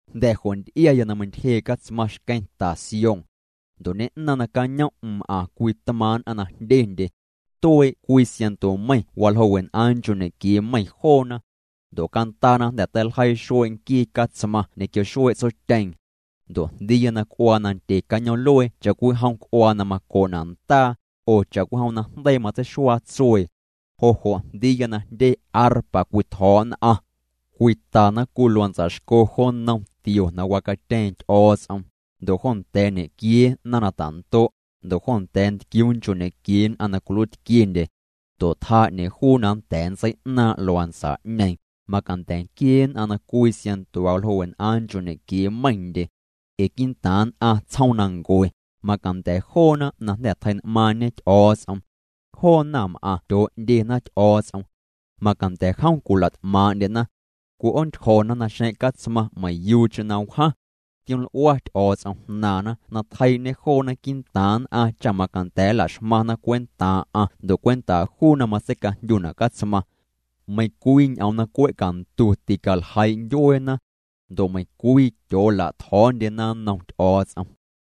Jnda̱ jo' nty'iaya na meintyjee' Catsmaⁿ xqueⁿ ta Sión. Ndo' ñeⁿ'naaⁿ' nacañom'm m'aⁿ cwii tmaaⁿ' nn'aⁿ na jndyendye. Tuee' cwii siaⁿnto meiⁿ waljoo' wen'aaⁿ nchoo' ñequiee meiⁿ joona. Ndo' cantaana jnda̱ teiljeii xuee' nquii Catsmaⁿ ñequio xuee' Tsotyeeⁿ. Ndo' jndiiya na c'uaa nandye cañoom'luee cha'cwijom c'uaa na maco'na' ndaa, oo cha'cwijom najndeii matseixuaa tsuee. Jo' jo' jndiiya na jndye arpa cwitjo̱o̱' nn'aⁿ. Cwitana cwii luantsa xco jo nnom tio na wacatyeeⁿ Ty'o̱o̱ts'om, ndo' jo nda̱a̱ ñequiee naⁿ na tando', ndo' jo nda̱a̱ ntquiuu nchoo' ñequiee nn'aⁿ na cwiluiitquiendye. Ndo' tjaa 'ñeeⁿ juu na nnda̱a̱ nntsei'naaⁿ' luantsa'ñeeⁿ, macanda̱ nquiee nn'aⁿ na cwii siaⁿnto waljoo' wen'aaⁿ nchoo' ñequiee meiⁿndye. Ee quii'ntaaⁿ nn'aⁿ tsjoomnancue, macanda̱ joona na jnda̱ tjei'n'maaⁿñe Ty'o̱o̱ts'om. Joo naⁿm'aⁿ tyoo'ndyena Ty'o̱o̱ts'om. Macanda̱ jom cwila't'maaⁿ'ndyena. Cwi'oontyjo̱na naxeⁿ' Catsmaⁿ meiⁿyuucheⁿ na wjaⁿ. Tioml'ua Ty'o̱o̱ts'om jnaaⁿna na tjeii'ñê joona quii'ntaaⁿ nn'aⁿ cha macanda̱ nla'xmaⁿna cwentaaⁿ'aⁿ ndo' cwentaa' juu na matseicajndyuna' Catsmaⁿ. Meiⁿcwii ñ'oom na cwe' cantu ticaljeii' ndyueena. Ndo' meiⁿcwii tyoola'tjo̱o̱ndyena nnom Ty'o̱o̱ts'om.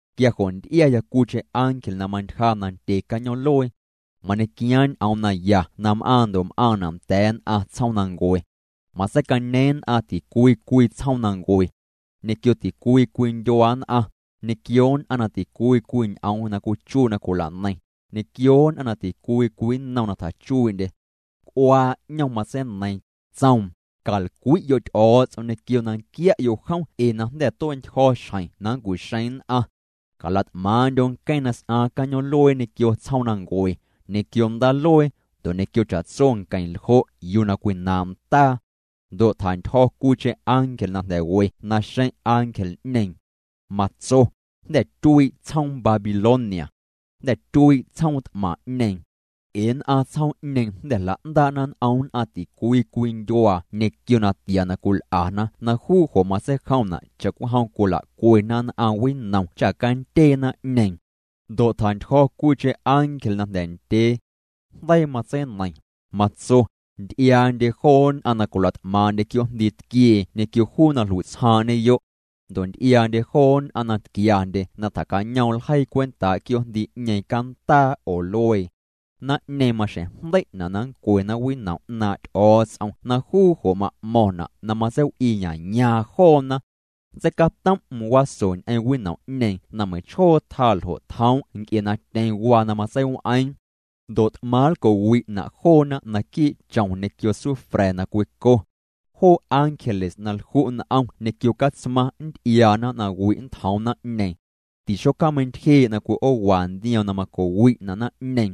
Quia jo' nty'iaya cwiicheⁿ ángel na mantyja nandye cañoom'luee. Mañequiaaⁿ ñ'oom naya na m'aaⁿ ndo' m'aaⁿna' nda̱a̱ nn'aⁿ tsjoomnancue. Matseicañeeⁿ nn'aⁿ ticwii cwii tsjoomnancue, ñequio ticwii cwii ndyuaa nn'aⁿ, ñequio nn'aⁿ na ticwii cwii ñ'oom na cwichuii' na cwila'neiⁿ, ñequio nn'aⁿ na ticwii cwii nnom na tjachuii'ndye. C'uaa 'ñom matseineiiⁿ, tsoom: —Calcwi'yo' Ty'o̱o̱ts'om ñequio na nquia'yo' jom ee na jnda̱ tue'ntyjo̱ xjeⁿ na nncu'xeeⁿ nn'aⁿ. Cala't'maaⁿ'ndyo' nqueⁿ na s'aaⁿ cañoom'luee ñequio tsjoomnancue, ñequio ndaaluee, ndo' ñequio cha'tso nqueⁿljo' yuu na cwinaaⁿ' ndaa. Ndo' tjantyjo̱ cwiicheⁿ ángel na jnda̱ we naxeⁿ' ángel'ñeeⁿ. Matso: —Jnda̱ tyuii' tsjoom Babilonia. Jnda̱ tyuii' tsjoom t'maⁿ'ñeeⁿ. Ee nn'aⁿ tsjoom'ñeeⁿ jnda̱ jla'ndaa'na n'om nn'aⁿ ticwii cwii ndyuaa ñequio natia na cwil'ana na juu jo' matseijomna' cha'cwijom cwila'cwena nn'aⁿ winom cha candyee naⁿ'ñeeⁿ. Ndo' tjantyjo̱ cwiicheⁿ ángel na jnda̱ ndyee. Jndeii matseineiⁿ, matso: —Nty'iaa'ndye joo nn'aⁿ na cwila't'maaⁿ'ndye quioo'jndii tquiee ñequio juu na jlui'tsjaaⁿ'ñeyo'. Ndo' nty'iaa'ndye joo nn'aⁿ na tquiandye na tjacañoom ljeii cwentaa' quioo'jndii'ñeeⁿ cantaa oo luee. Naⁿ'ñeeⁿ maxjeⁿ jndei'na' na nncwena winom 'naaⁿ' Ty'o̱o̱ts'om na juu jo' ma'mo̱ⁿna' na matseiw'iiyayaaⁿ joona. Nntseicatom'm waso ñ'eⁿ winom'ñeeⁿ na meiⁿchjoo tjaa ljo' tjoom' nc'e na tyeⁿ waa na matseiw'eeⁿ. Ndo' t'maⁿ nlco'wi'na' joona naquii' chom ñequio sufra̱ na cwico. Joo ángeles na lju' n'om ñequio Catsmaⁿ nnty'iaana na wi' nntjoom naⁿ'ñeeⁿ. Tixocjaameintyjee' na cwi'oowa ndioom na maco'wi'na' naⁿ'ñeeⁿ.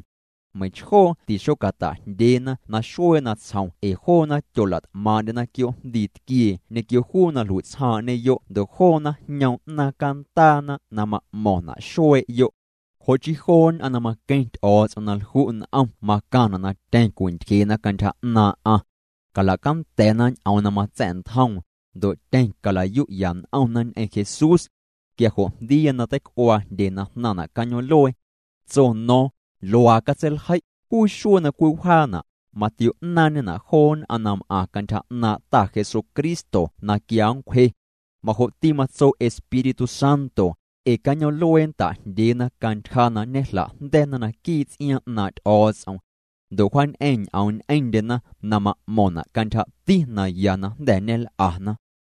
Meiⁿchjoo tixocata'jndyeena naxuee natsjom ee joona tyola't'maaⁿ'ndyena quioo'jndii tquiee ñequio juu na jlui'tsjaaⁿ'ñeyo' ndo' joona jñoom 'naaⁿ cantaana na ma'mo̱ⁿna' xuee'yo'. Jo' chii joo nn'aⁿ na maqueⁿ Ty'o̱o̱ts'om na lju' n'om macaⁿna' na tyeⁿ cwintyjee'na cantyja 'naaⁿ'aⁿ. Cala'canda̱na ñ'oom na matsa̱'ntjoom, ndo' tyeⁿ cala'yu'ya n'omna ñ'eⁿ Jesús. Quia jo' jndiiya na teic'uaa jndye na jnaⁿna' cañoom'luee. Tso no̱o̱ⁿ: —Luaa catseiljei': “Juu xuee na cwiwjaana', matio'naaⁿñena' joo nn'aⁿ na m'aⁿ cantyja 'naaⁿ' Ta Jesucristo na quia nncwje.” Majo'ti matso Espírtu Santo, ee cañoom'luee nta'jndyeena cantyja na ñejla'jnda̱na naquii' ts'iaaⁿ 'naaⁿ' Ty'o̱o̱ts'om. Ndo' wjaañ'eⁿ ñ'oom ñ'eⁿndyena na ma'mo̱ⁿna' cantyjati na ya na jnda̱ ñel'ana.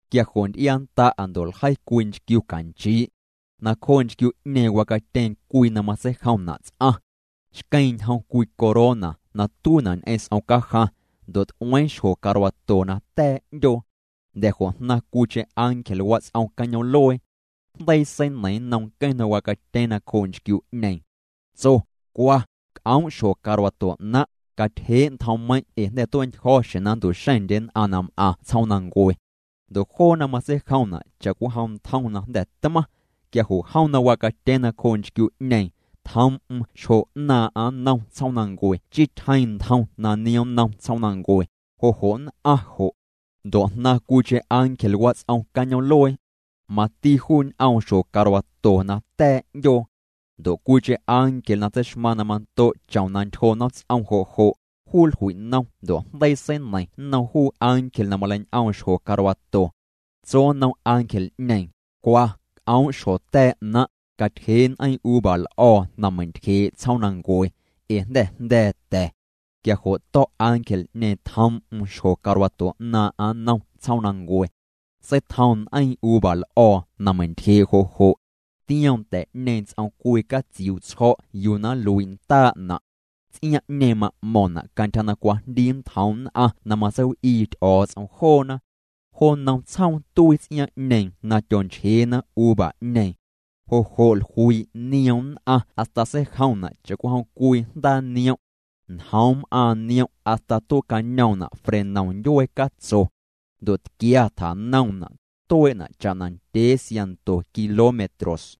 Quia jo' nty'iannda'a ndo' ljei cwii nchquiu canchii'. Nacjoo' nchquiu'ñeeⁿ wacatyeeⁿ cwii na matseijomna' ts'aⁿ. Xqueeⁿ ñjom cwii corona na tuiina' ñ'eⁿ s'om cajaⁿ, ndo' t'ueeⁿ xjo carwato na ta̱a̱ 'ndyoo. Jnda̱ jo' jnaⁿ cwiicheⁿ ángel wats'om cañoom'luee. Jndeii seineiⁿ nnom nqueⁿ na wacatyeeⁿ nacjoo' nchquiu'ñeeⁿ. Tso: —Cwa, c'oom' xjo carwato 'naⁿ', catyjee' ntjommeiⁿ' ee jnda̱ tue'ntyjo̱ xjeⁿ na nntu'xeⁿndye nn'aⁿ na m'aⁿ tsjoomnancue. Ndo' joona matseijomna' cha'cwijom ntjom na jnda̱ tmaⁿ. Quia jo' jom na wacatyeeⁿ nacjoo' nchquiu'ñeeⁿ, tjoom'm xjo 'naaⁿ'aⁿ nnom tsjoomnancue chii tyjeeⁿ ntjom na niom nnom tsjoomnancue, jo' jo' nn'aⁿ jo'. Ndo' jnaⁿ cwiicheⁿ ángel wats'om cañoom'luee. Mati juu ñ'oom xjo carwato na ta̱a̱ 'ndyoo. Ndo' cwiicheⁿ ángel na tseixmaⁿ na mando' chom na ntyjo nomts'om jo' jo', juu jlui'nom ndo' jndeii seineiⁿ nnom juu ángel na maleiñ'oom xjo carwato. Tso nnom ángel'ñeeⁿ: —Cwa, c'oom' xjo ta̱a̱ 'naⁿ', catyjee' n'eiiⁿ uva l'o̱o̱ na meintyjee' tsjoomnancue, ee jnda̱ jnda̱a̱ ta̱. Quia jo' to̱' ángel'ñeeⁿ tjoom'm xjo carwato 'naaⁿ'aⁿ nnom tsjoomnancue. Seitjoom n'eiiⁿ uva l'o̱o̱ na meintyjee' jo' jo'. Tioom ta̱'ñeeⁿ ts'om cwii catsiuu' tsjo̱' yuu na nluii' ndaa'na'. Ts'iaaⁿ'ñeeⁿ ma'mo̱ⁿna' cantyja na cwajndii nntjoom nn'aⁿ na matseiw'ii Ty'o̱o̱ts'om joona. Jo nnom tsjoom tuii ts'iaaⁿ'ñeeⁿ na tyonchjeena uva'ñeeⁿ. Jo' jo' jluii' nioom nn'aⁿ hasta seijomna' cha'cwijom cwii jndaa niom'. Njoom m'aaⁿ niom' hasta tue'cañoomna' frenom ndyuee catso. Ndo' tquia tjanoomna', tuee'na' cha'na ndyee siaⁿnto kilómetros.